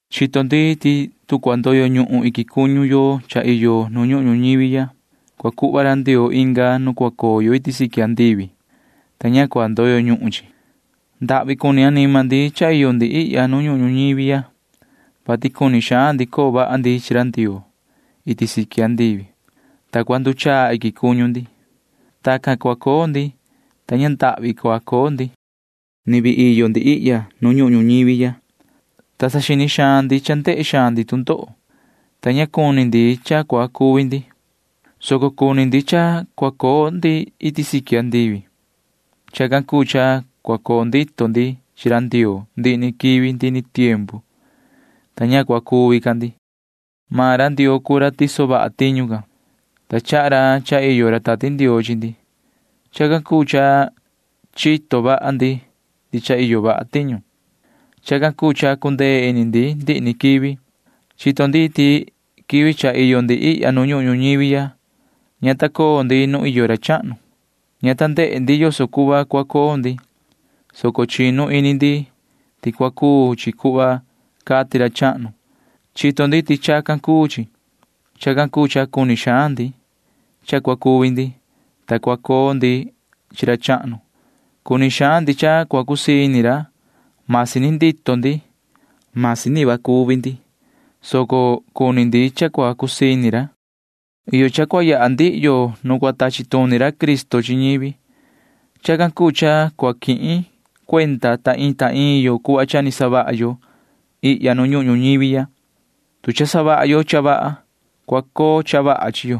Chito ndi ti tu cua ndoyo ñuhun iquin cuñu yo cha iyo nu ñuhun ñuñivi ya, cua cuhva ra Ndioo inga nu cua coo yo iti siqui andivi, ta ña cua ndoyo ñuhun chi. Ndahvi cuni anima ndi cha iyo ndi ihya nu ñuhun ñuñivi ya, vati cuni xaan ndi coo vaha ndi chi ra Ndioo iti siqui andivi, ta cua nduchaa iquin cuñu ndi. Tacan cua coo ndi, ta ña ndahvi cua coo ndi. Ni vii iyo ndi ihya nu ñuhun ñuñivi ya, ta saxini xaan ndi. Cha ndehe xaan ndi tu ndoho, ta ña cuni ndi cha cua cuvi ndi, soco cuni ndi cha cua coo ndi iti siqui andivi. Chacan cuu cha cua coo ndito ndi chi Ndioo ndihi ni quivi ndihi ni tiempu, ta ña cua cuvi ca ndi. Maan ra Ndioo cuu ra tiso vaha tiñu can, ta chaha ra cha iyo ra Tati Ndioo chi ndi. Chacan cuu cha chito vaha ndi ti cha iyo vaha tiñu. Chacan cuu cha cundee ini ndi ndihi ni quivi. Chito ndi ti quivi cha iyo ndi ihya nu ñuhun ñuñivi ya ña ta coo ndi nu iyo ra chahnu. Ña ta ndehe ndi yoso cuhva cua coo ndi, soco chinu ini ndi ti cua cuu chi cuhva cati ra chahnu. Chito ndi ti chacan cuu chi. Chacan cuu cha cuni xaan ndi cha cua cuvi ndi, ta cua coo ndi chi ra chahnu. Cuni xaan ndi cha cua cusii ini ra. Masi ni ndito ndi, masi ni cuvi ndi, soco cuni ndi cha cua cusii ini ra. Iyo cha cua yaha ndihi yo nu cua tachi tuni ra Cristo chi ñivi. Chacan cuu cha cua quihin cuenda ta iin ta iin yo cuhva cha ni savaha yo ihya nu ñuhun ñuñivi ya. Tu cha savaha yo cha vaha, cua coo cha vaha chi yo.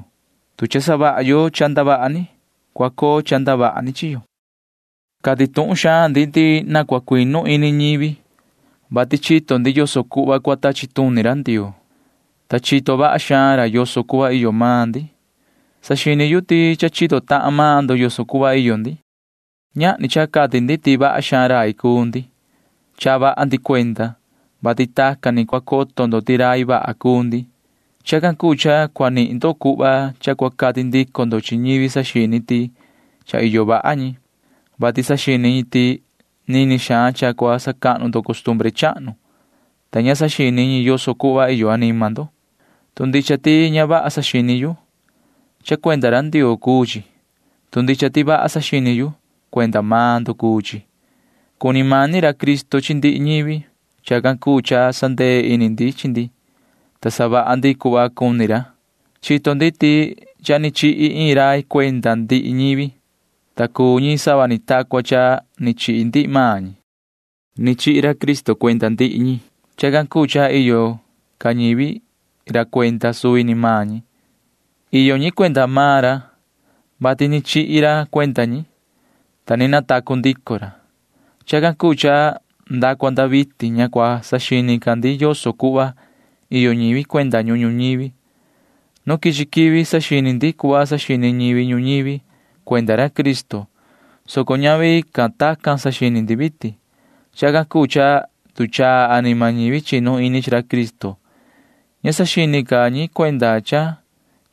Tu cha savaha yo cha ndavaha ni, cua coo cha ndavaha ni chi yo. Cati tuhun xaan ndi ti na cua cuinu ini ñivi, vati chito ndi yoso cuhva cua tachi tuni ra Ndioo, ta chito vaha xaan ra yoso cuhva iyo maan ndi. Saxini yu ti cha chito tahan maan ndo yoso cuhva iyo ndi. Ñahni cha cati ndi ti vaha xaan rai cuu ndi. Chaha vaha ndi cuenda, vati tacan ni cua coto ndo ti rai vaha cuu ndi. Chacan cuu cha cua nihin ndo cuhva cha cua cati ndico ndo chi ñivi saxini ti cha iyo vaha ñi, vati saxini ñi ti nini xaan cha cua sacahnu ndo costumbre chahnu, ta ña saxini ñi yoso cuhva iyo anima ndo. Tu ndicha ti ña vaha saxini yu, cha cuenda ra Ndioo cuu chi. Tu ndicha ti vaha saxini yu, cuenda maan ndo cuu chi. Cuni mani ra Cristo chi ndihi ñivi. Chacan cuu cha sandee ini ndi chi ndi, ta savaha ndi cuhva cuni ra. Chito ndi ti cha ni chihi iin rai cuenda ndihi ñivi, ta cuu ñi sava ni ta cua cha ni chihi ndihi maan ñi. Ni chihi ra Cristo cuenda ndihi ñi. Chacan cuu cha ña iyo ca ñivi ra cuenda suvi ni maan ñi. Iyo ñi cuenda maan ra, vati ni chihi ra cuenda ñi, ta ni natacu ndico ra. Chacan cuu cha nda cua nda vitin ña cua saxini ca ndi yoso cuhva iyo ñivi cuenda ñuhun ñuñivi. Nu quichi quivi saxini ndi cuhva saxini ñivi ñuñivi cuenda ra Cristo, soco ñavi ca tacan saxini ndi vitin. Chacan cuu cha nduchaa anima ñivi chinu ini chi ra Cristo. Ña saxini ca ñi cuenda cha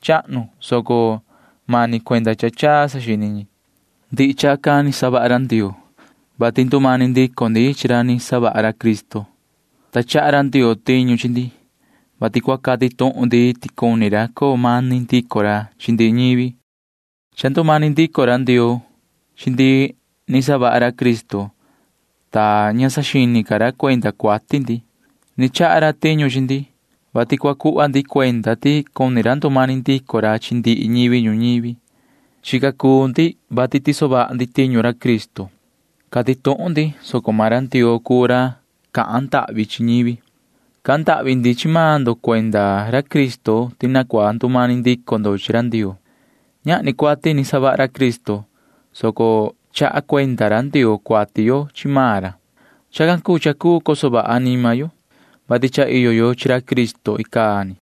chahnu, soco mani cuenda cha chaa saxini ñi. Ndihi chacan ni savaha ra Ndioo, vati ndumani ndico ndi chi ra ni savaha ra Cristo, ta chaha ra Ndioo tiñu chi ndi, vati cua cati tuhun ndi ti cuni ra coo mani ndico ra chi ndihi ñivi. Cha ndumani ndico ra Ndioo chi ndi ni savaha ra Cristo, ta ña saxini ca ra cuenda cuati ndi. Ni chaha ra tiñu chi ndi, vati cua cuhva ndi cuenda ti cuni ra ndumani ndico ra chi ndihi ñivi ñuñivi. Chica cuu ndi, vati tiso vaha ndi tiñu ra Cristo. Cati tuhun ndi, soco maan ra Ndioo cuu ra cahan ndahvi chi ñivi. Cahan ndahvi ndi chi maan ndo cuenda ra Cristo ti na cua ndumani ndico ndo chi ra Ndioo. Ñahni cuati ni savaha ra Cristo, soco chaha cuenda ra Ndioo cuati yo chi maan ra. Chacan cuu cha cuu coso vaha anima yo, vati cha iyo yo chi ra Cristo icaa ni.